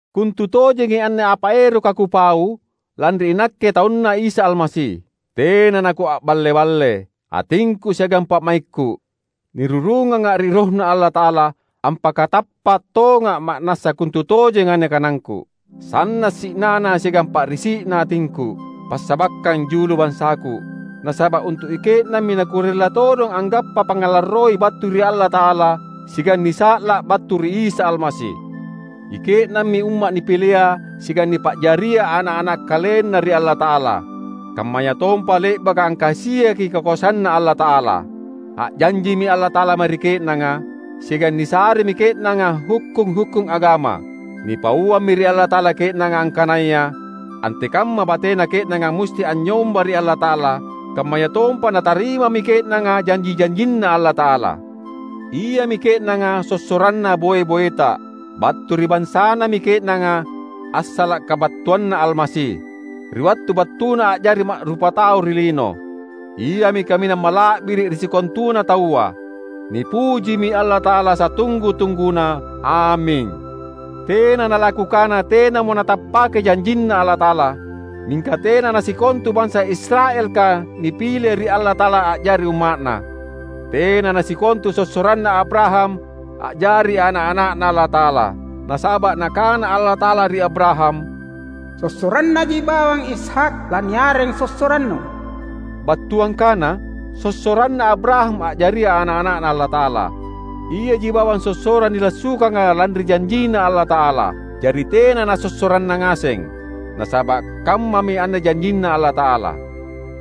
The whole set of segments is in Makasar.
Kontutojengi anne apa eroka kupau lanri inakke taunNa’ Isa Almasi. Tena nakua’balle-balle. Atingku siagang pa’maikku, nirurunganga ri RohNa Allata’ala, ampakatappa’ tonga’ ma’nassana kontutojengi anne kanangku. Sanna’ si’nana siagang pa’risi’na atingku, passabakkang julu bansaku. Nasaba’ untu’ ike’nammi nakurella todong anggappa pangngalarroi battu ri Allata’ala siagang nisa’la’ battu ri Isa Almasi. Ike’nammi umma’ nipilea siagang nipa’jaria ana’-ana’ KalenNa ri Allata’ala, kammayatompa le’baka angkasiaki kakoasanNa Allata’ala. A’janjimi Allata’ala mae ri ke’nanga, siagang nisaremi ke’nanga hukkung-hukkung agama. Nipauammi ri Allata’ala ke’nanga angkanaya antekamma batena ke’nanga musti anynyomba ri Allata’ala; kammayatompa natarimami ke’nanga janji-janjinNa Allata’ala. Iami ke’nanga sossoranna boe-boeta. Battu ri bansanami ke’nanga assala’ kabattuanNa Almasi, ri wattu battuNa a’jari ma’rupatau ri lino. Iami kaminang mala’biri’ ri sikontuna taua. Nipujimi Allata’ala satunggu-tungguna! Aming. Tena nalakukana tenamo natappake janjinNa Allata’ala; mingka tena nasikontu bansa Israelka nipile ri Allata’ala a’jari umma’Na. Tena nasikontu sossoranna Abraham a’jari ana’-ana’Na Allata’ala. Nasaba’ Nakana Allata’ala ri Abraham, "Sossorannaji bawang Ishak laniareng sossorannu." Battuang kana, sossoranna Abraham a’jaria ana’-ana’Na Allata’ala, iaji bawang sossorang nilassukanga lanri janjinNa Allata’ala; jari tena nasossoranna ngaseng. Nasaba’ kammami anne janjinNa Allata’ala,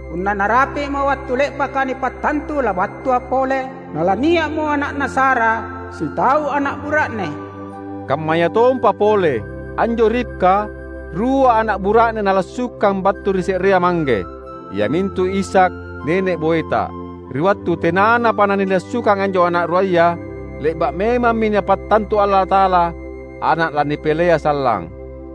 "Punna narapi’mo wattu le’baka nipattantu labattua pole, nalania’mo ana’na Sara, sitau ana’ bura’ne." Kammayatompa pole: Anjo Ribka rua ana’ bura’ne nalassukang battu ri se’rea mangge, iamintu Ishak, nene’ boeta. Ri wattu tenanapa nanilassukangi anjo ana’ ruaya, le’ba’ memammi Napattantu Allata’ala ana’ lanipilea sallang.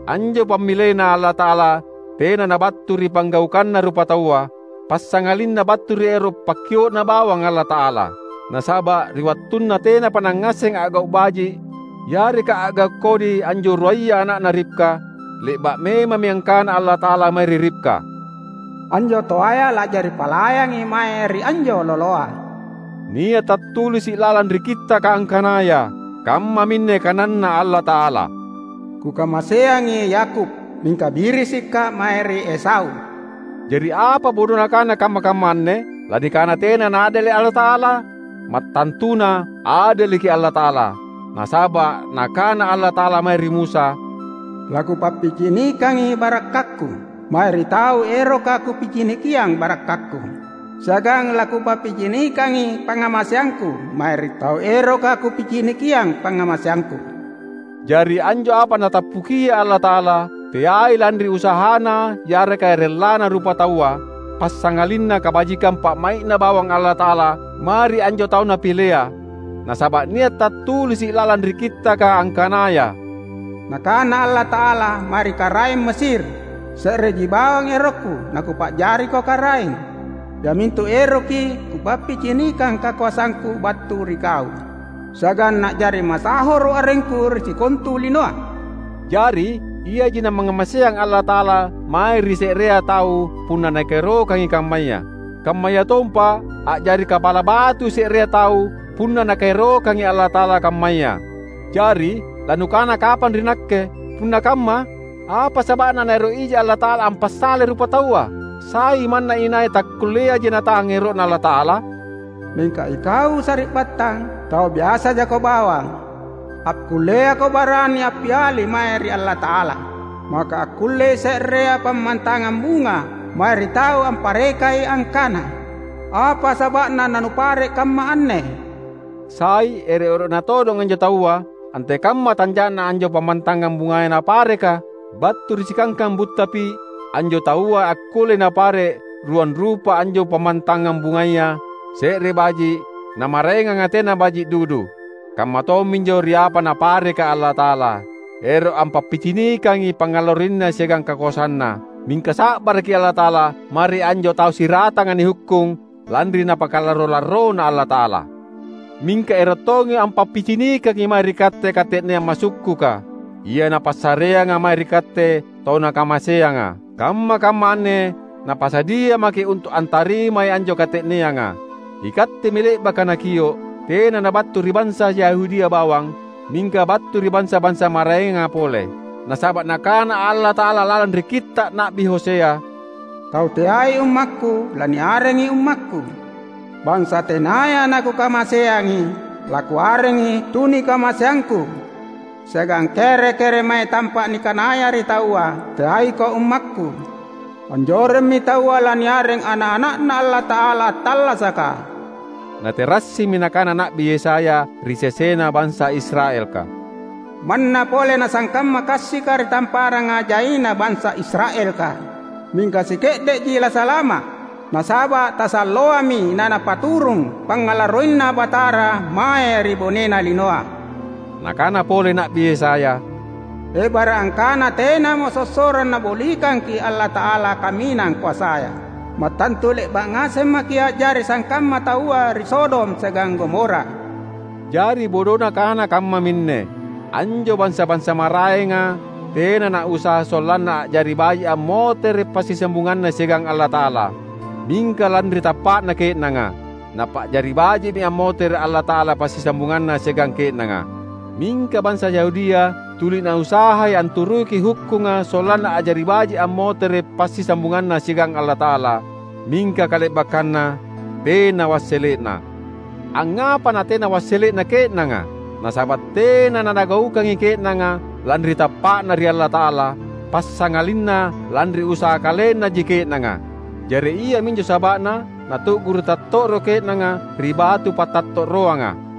Anjo pammileNa Allata’ala tena nabattu ri panggaukanna rupataua, passangalinna battu ri ero’ pakkio’Na bawang Allata’ala. Nasaba’ ri wattunna tenapa nangngasseng a’gau’ baji’ yareka a’gau’ kodi anjo ruaya ana’na Ribka, le’ba’ memammi angkana Allata’ala mae ri Ribka, "Anjo toaya la’jari palayangi mae ri anjo loloa." Nia’ tattulisi’ lalang ri Kittaka angkanaya, kammaminne kananNa Allata’ala, "Kukamaseangi Yakub, mingka birisikKa’ mae ri Esau." Jari apa bodona kana kamma-kamma anne? Lanikana tena naadele’ Allata’ala? Mattantuna adeleki Allata’ala! Nasaba’ Nakana Allata’ala mae ri Musa, "LaKupappicinikangi barakkakKu, mae ri tau eroka Kupicinikiang barakkakKu, siagang laKupappicinikangi pangngamaseangKu mae ri tau eroka Kupicinikiang pangngamaseangKu." Jari anjo apa Natappukia Allata’ala, teai lanri usahana yareka rellana rupataua, passangalinna kabajikang pa’mai’Na bawang Allata’ala mae ri anjo tau Napilea. Nasaba’ nia’ tattulisi’ lalang ri Kittaka angkanaya, "Nakana Allata’ala mae ri karaeng Mesir, ‘Se’reji bawang erokKu naKupa’jariko karaeng, iamintu eroki Kupappicinikang kakoasangKu battu ri kau, siagang na’jari masahoro’ arengKu ri sikontu linoa.’" Jari, iaji namangngamaseang Allata’ala mae ri se’rea tau punna Nakaerokangi kammaya. Kammayatompa a’jari kapala batui se’rea tau punna Nakaerokangi Allata’ala kammaya. Jari, lanukana kapang ri nakke, "Punna kamma, apa saba’na Naero’ ija Allata’ala ampasalai rupataua? Sai manna inai takkulleaji natahang ero’Na Allata’ala?" Mingka ikau sari’battang, tau biasajako bawang! Takkulleako barani appiali mae ri Allata’ala! Maka akkullei se’rea pammantangang bunga mae ri tau amparekai, angkana, "Apa saba’na nanupare’ kamma’ anne?" Sai ero’-ero’na todong anjo taua antekamma tanja’na anjo pammantangang bungaya napareka? Battu ri sikangkang butta pi’ anjo taua akkullei napare’ ruang rupa anjo pammantangang bungaya: se’re baji’, namaraenganga tena nabaji’ dudu. Kamma tomminjo ri apa Napareka Allata’ala. Eroki ampappicinikangi pangngalarroinNa siagang kakoasanNa. Mingka sa’baraki Allata’ala mae ri anjo tau siratanga nihukkung lanri napakalarro-larrona Allata’ala. Mingka ero’ tongi ampappicinikangi mae ri katte kate’neang masukkuka, ia Napassareanga mae ri katte tau Nakamaseanga. Kamma-kamma anne Napasadia maki’ untu’ antarimai anjo kate’neanga. Ikattemi le’baka Nakio’, tena nabattu ri bansa Yahudia bawang, mingka battu ri bansa-bansa maraenga pole. Nasaba’ Nakana Allata’ala lalang ri Kitta’ Na’bi Hosea, "Tau teai ummakKu, laniarengi ‘UmmakKu’. Bansa tenaya naKukamaseangi, laKuarengi ‘TunikamaseangKu’. Siagang kere-keremae tampa’ nikanaya ri taua, ‘Teaiko ummakKu,’ anjoremmi taua laniareng ana’-ana’Na Allata’ala attallasaka." Naterassimi nakana Na’bi Yesaya ri sesena bansa Israelka, "Manna pole nasangkamma kassika ri tamparanga jaina bansa Israelka, mingka sike’de’ji lasalama’; nasaba’ tasalloami naNapaturung pangngalarroinNa Batara mae ri bonena linoa." Nakana pole Na’bi Yesaya, "Ebara’ angkana tenamo sossorang Nabolikangki’ Allata’ala Kaminang Koasaya, mattantu le’ba’ ngaseng maki’ a’jari sangkamma taua ri Sodom siagang Gomora." Jari bodona kana kammaminne: Anjo bansa-bansa maraenga tena nausaha sollanna a’jari baji’ ammotere’ passisambunganna siagang Allata’ala. Mingka lanri tappa’na ke’nanga, Napa’jari baji’mi ammotere’ Allata’ala passisambunganNa siagang ke’nanga. Mingka bansa Yahudia tuli nausahai anturuki hukkunga sollanna a’jari baji’ ammotere’ passisambunganna siagang Allata’ala. Mingka kale’bakkanna tena wassele’na. Angngapa natena wassele’na ke’nanga? Nasaba’ tena nanagaukangi ke’nanga lanri tappa’na ri Allata’ala, passangalinna lanri usaha kalennaji ke’nanga. Jari iaminjo saba’na natu’guru’ tatto’ro ke’nanga ri "Batu Pattatto’roanga".